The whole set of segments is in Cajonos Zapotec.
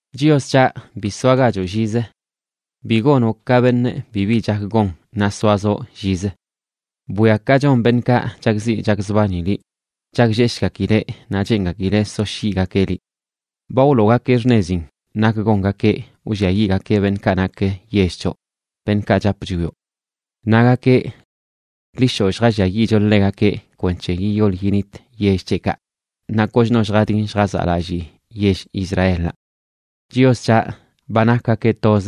Chios c̱haꞌ, ¡bi soagachoꞌ llizə! ¡Bi gonoꞌ ka beṉꞌ bibi chak gon naꞌ soazoꞌ llizə! Bwia ka chon beṉꞌkaꞌ chakziꞌ chakzbani liꞌ; chaklleshgakileꞌ naꞌ cheengakileꞌ soshyiꞌgakeꞌ liꞌ. Ba wloogakeꞌ xṉezin nak gongakeꞌ wlliayiꞌgakeꞌ beṉꞌkaꞌ nak yell c̱hoꞌ, beṉꞌkaꞌ chapꞌ chwioꞌ. Nagakeꞌ: “Ḻi shoꞌ, lljalliayiꞌcho ḻegakeꞌ kwenc̱he yiyol yinit yell c̱heꞌkaꞌ naꞌ kochno lljadin lljazaꞌlallii yell Israelaꞌ.” Chios c̱haꞌ, ba nakgakeꞌ toz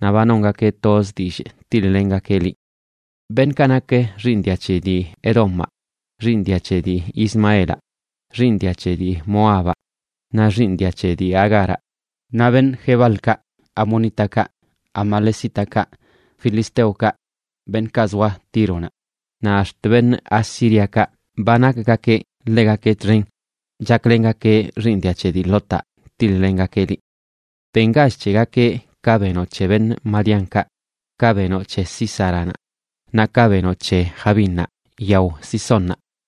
naꞌ ba nongakeꞌ toz dillꞌ tiḻ-lengakeꞌ liꞌ. Beṉꞌkaꞌ nak xiiṉ dia c̱he dii Edomaꞌa, xiiṉ dia c̱he dii Ismaelaꞌ, xiiṉ dia c̱he dii Moabaꞌ, naꞌ xiiṉ dia c̱he dii Agaraꞌ, naꞌ beṉꞌ Gebalkaꞌ, beṉꞌ amonítakaꞌ, beṉꞌ amalecítakaꞌ, beṉꞌ filisteokaꞌ beṉꞌkaꞌ zoa Tíronaꞌ, naꞌ ax̱t beṉꞌ Asíriakaꞌ ba nakgakeꞌ ḻegakeꞌ txen, chaklengakeꞌ xiiṉ dia c̱he dii Lotaꞌ tiḻ-lengakeꞌ liꞌ. Bengach c̱hegakeꞌ ka benoꞌ c̱he beṉꞌ Madiánkaꞌ, ka benoꞌ c̱he Sísaranaꞌ, naꞌ ka benoꞌ c̱he Jabínnaꞌ yao Cisónnaꞌ,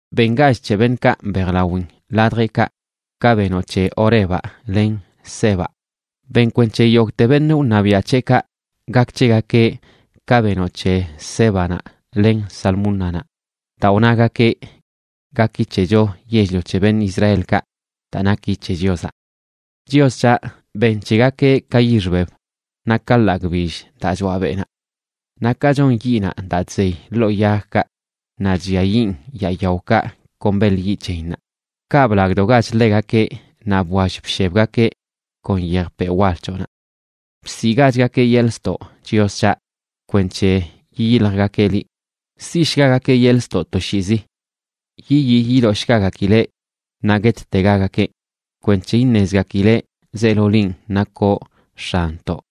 Bengach c̱he beṉꞌkaꞌ mbejlawin ladjeꞌkaꞌ ka benoꞌ c̱he Orebaꞌ len Zeebaꞌ; ben kwenc̱he yogteꞌ beṉꞌ wṉabiaꞌ c̱heꞌkaꞌ gak c̱hegakeꞌ ka benoꞌ c̱he Zébanaꞌ len Zalmúnanaꞌ, daa wnagakeꞌ: “Gaki c̱hecho yell-lio c̱he beṉꞌ Israelkaꞌ daa naki c̱he Chiozaꞌ.” Chios c̱haꞌ, ben c̱hegakeꞌ ka yix beb naꞌ ka ḻagꞌ bill daa choaꞌ beꞌnaꞌ. Naꞌ ka chon yiꞌnaꞌ daa chzey ḻoo yagkaꞌ naꞌ chlliayiꞌn yaa yaokaꞌ kon beḻ yiꞌ c̱heyinnaꞌ, kaꞌ blagdogach ḻegakeꞌ naꞌ bwall bshebgakeꞌ kon yejpeꞌ wal c̱hoꞌnaꞌ. ¡Bsiꞌgachgakeꞌ yeḻꞌ ztoꞌ, Chios c̱haꞌ, kwenc̱he yiyiljgakeꞌ liꞌ! Siꞌshgagakeꞌ yeḻꞌ ztoꞌ toshiizi; ¡yiyii yidoshgagakileꞌ naꞌ guettegagakeꞌ!, kwenc̱he iṉezgakileꞌ zeelo linꞌ nakoꞌ X̱anntoꞌ,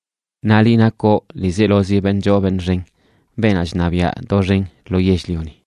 naꞌ liꞌ nakoꞌ ḻiizelozi beṉꞌ choo beṉꞌ xen, beenaꞌ chṉabiaꞌ doxen lo yell-lioni.